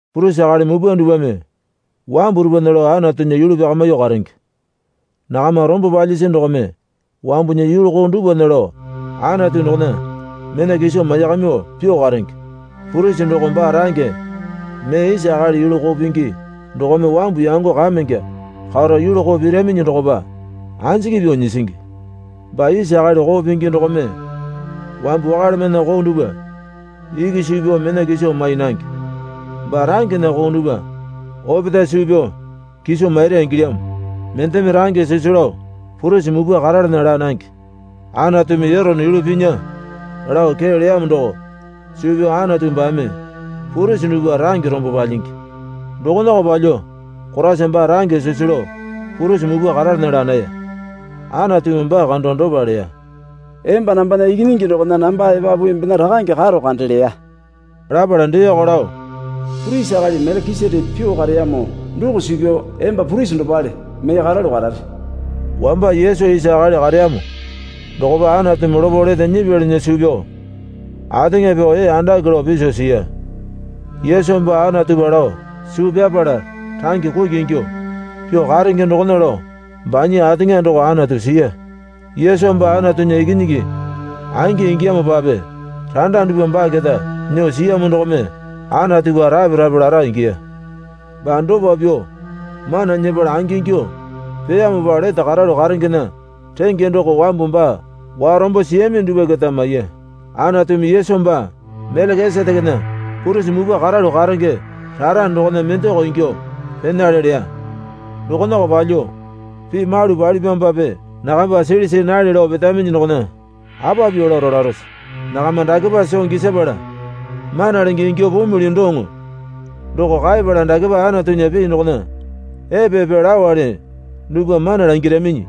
Purisi akali mupwa dupwame wambu dupwana lao Anatunya yulu pyakamyuo karenge. Nakama rombo palyisi dokome wambunya yulu koo dupwana lao Anatu dokona mena kiso maiyakamyuo pyuo karenge. Purisi doko baa range mee isa akali yulu koo pingi dokome wambu yango kamenge karo yulu koo piraminyi dokopa anjiki pyuo nyisingi. Baa isa akali koo pingi dokome wambu wakalemana koo dupwa iki suu pyao mena kiso mai nange. Baa rangena koo dupwa opetae suu pyao kiso maira ingilyamo. Mendeme range sisu lao purisi mupwa karalana laa nange. Anatumi Erone yulu pinya lao kee leyamo doko suu pyao Anatu baame purisi dupwa range rombo palyingi. Dokonako palyuo Koraisa baa range sisu lao purisi mupwa karalana laa naya. Anatumi baa kando dopa leya. Emba nambana Ikinyingi dokona namba epapu embena rakange karo kande leya. Lapala deeko lao, Purisi akali Melekiseteke pyuo kareyamo doko suu pyao emba purisi dopale mee karalu karare. Wamba Yesu isa akali kareyamo dokopa Anatumi lopo lete nyipyalinya suu pyao ateŋa pyao ee andake lao piso siya. Yesu baa Anatupa lao suu pyapala range kuki ingyuo pyuo karenge dokona lao banya ateŋa doko Anatu siya. Yesu baa Anatunya Ikinyingi angi ingiyamopape randa dupwa baa keta nyuo siyamo dokome Anatupa rape rape lara ingiya. Baa dopa pyuo mana nyepala angingyuo peyamopa lete karalu karengena renge doko wambu baa warombo siyami dupwa keta maiya. Anatumi Yesu baa Melekisetekena purisi mupwa karalu karenge rara dokona mendako ingyuo penale leya. Dokonako palyuo pii malu palipyamopape nakamba sili see nale lao petaminyi dokona apa pyuo lao rolarose? Nakama dakepa soo gisapala mana lenge ingyuo pumili doŋo doko kaepala dakepa Anatunya pii dokona epe epe laowale dupwa mana langiraminyi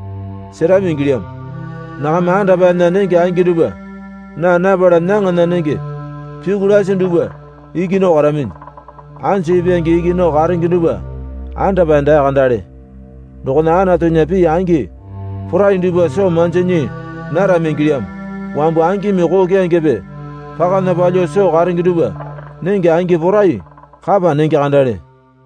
serami ingilyamo. Nakama andapaena nenge angi dupwa naa napala nyaŋana nenge pyuku lasi dupwa iki nao karaminyi. Anju ipwange iki nao karenge dupwa andapae daa kandale dokona Anatunya pii angi porai dupwa soo manji nyii narami ingilyamo. Wambu angimi koo keyangepe pakana palyuo soo karenge dupwa nenge angi porai kapa nenge kandale.